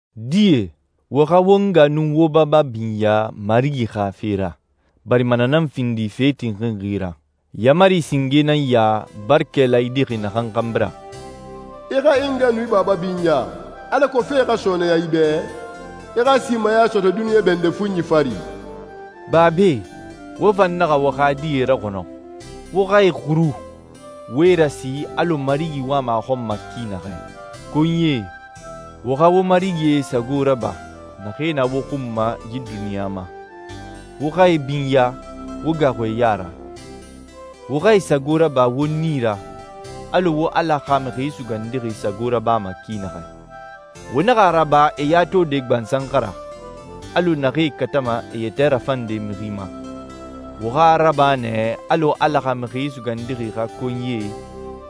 Die, wo xa wo nga nun wo baba binya Marigi xa fe ra, barima na nan findi fe tinxinxi ra. Yaamari singe nan ya, barakɛ laayidixi naxan xanbi ra: «I xa i nga nun i baba binya, alako fee xa sɔɔnɛya i bɛ, i xa simaya sɔtɔ duniɲa bɛndɛ fuɲi fari.» Babae, wo fan naxa wo xa die raxɔnɔ. Wo xa e xuru, wo e rasi alɔ Marigi wama a xɔn ma ki naxɛ. Konyie, wo xa wo marigie sago raba, naxee na wo xun ma yi duniɲa ma. Wo xa e binya, wo gaaxu e ya ra. Wo xa e sago raba wo nii ra, alɔ wo Ala xa Mixi Sugandixi sago rabama ki naxɛ. Wo naxa a raba e ya tode gbansan xa ra, alɔ naxee katama e yɛtɛ rafande mixi ma. Wo xa a raba nɛ alɔ Ala xa Mixi Sugandixi xa konyie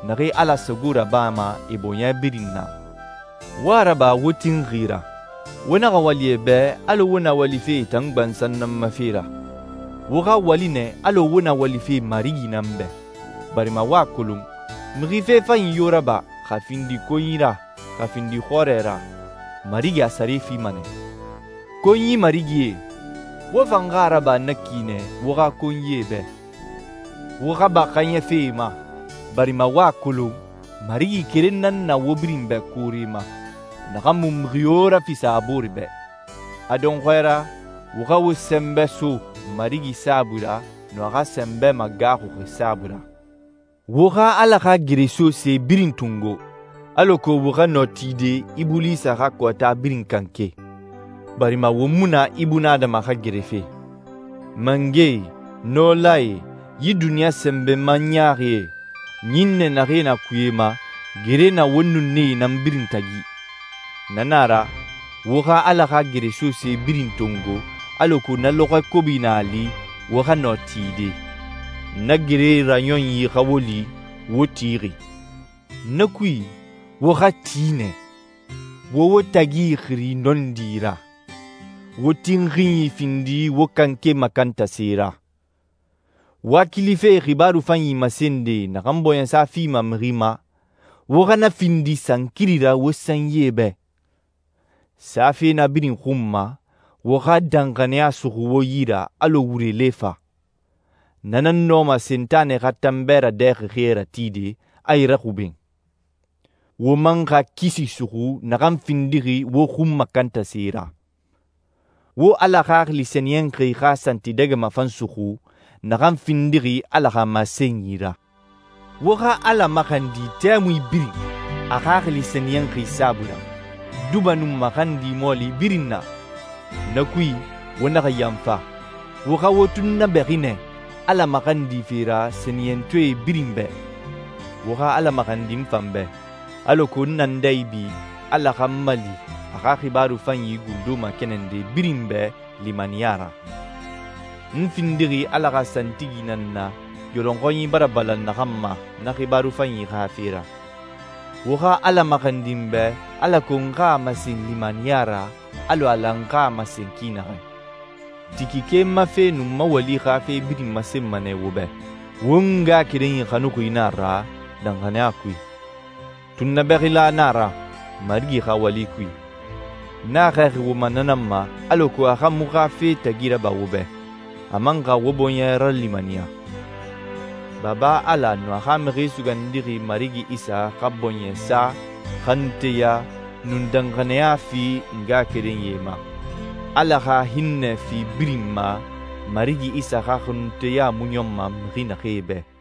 naxee Ala sago rabama e bɔɲɛ birin na. Wo a raba wo tinxi ra. Wo naxa wali e bɛ alɔ wo na walife e tan gbansan nan ma fe ra. Wo xa wali nɛ alɔ wo na walife Marigi nan bɛ, barima wo a kolon, mixi fe fanyi yo raba, xa a findi konyi ra, xa a findi xɔrɛ ra, Marigi a sare fima nɛ. Konyi marigie, wo fan xa a raba na ki nɛ wo xa konyie bɛ. Wo xa ba xaaɲɛfe e ma, barima wo a kolon Marigi keren nan na wo birin bɛ koore ma, naxan mu mixi yo rafisa a boore bɛ. A dɔnxɔɛ ra, wo xa wo sɛnbɛ so Marigi saabui ra nun a xa sɛnbɛ magaaxuxi saabui ra. Wo xa Ala xa geresose birin tongo, alako wo xa nɔ tide Ibulisa xa kɔɔta birin kanke. Barima won mu na ibunadama xa gerefe. Mangɛe, nɔlae, yi duniɲa sɛnbɛma ɲaaxie, ɲinnɛ naxee na kuye ma, gere na won nun nee nan birin tagi. Na nan a ra, wo xa Ala xa geresose birin tongo alako na lɔxɔɛ kobi na a li, wo xa nɔ tide. Na gere raɲɔnyi xa wo li wo tixi. Na kui, wo xa ti nɛ. Wo wo tagi ixiri nɔndi ra. Wo tinxinyi findi wo kanke makantase ra. Wakilife xibaaru fanyi masende naxan bɔɲɛsa fima mixi ma, wo xa na findi sankiri ra wo sanyie bɛ. Safe na birin xun ma, wo xa danxaniya suxu wo yi ra alɔ wure lefa. Na nan nɔma Sentanɛ xa tanbɛ radɛxɛxie ratide, a e raxuben. Wo man xa kisi suxu naxan findixi wo xun makantase ra. Wo Ala Xaxili Sɛniyɛnxi xa santidɛgɛma fan suxu naxan findixi Ala xa masenyi ra. Wo xa Ala maxandi tɛmui birin a Xaxili Sɛniyɛnxi saabui ra, duba nun maxandi mɔɔli birin na. Na kui, wo naxa yanfa. Wo xa wo tunnabɛxi nɛ Ala maxandife ra sɛniyɛntɔɛ birin bɛ. Wo xa Ala maxandi n fan bɛ, alako n na n dɛ ibi, Ala xa n mali a xa xibaaru fanyi gundo makɛnɛnde birin bɛ limaniya ra. N findixi Ala xa santigi nan na yɔlɔnxɔnyi bara balan naxan ma na xibaaru fanyi xa fe ra. Wo xa Ala maxandi n bɛ alako n xa a masen limaniya ra alɔ n lan n xa a masen ki naxɛ. Tikike n ma fe nun n ma wali xa fe birin masenma nɛ wo bɛ. Won ngaxakerenyi xanuxi nan a ra danxaniya kui. Tunnabɛxila nan a ra Marigi xa wali kui. N a xɛɛxi wo ma na nan ma, alako a xa muxu xa fe tagi raba wo bɛ, a man xa wo bɔɲɛ ralimaniya. Baba Ala nun a xa Mixi Sugandixi Marigi Isa xa bɔɲɛsa, xanunteya, nun danxaniya fi ngaxakerenyie ma. Ala xa hinnɛ fi birin ma Marigi Isa xa xanunteya mu ɲɔnma mixi naxee bɛ.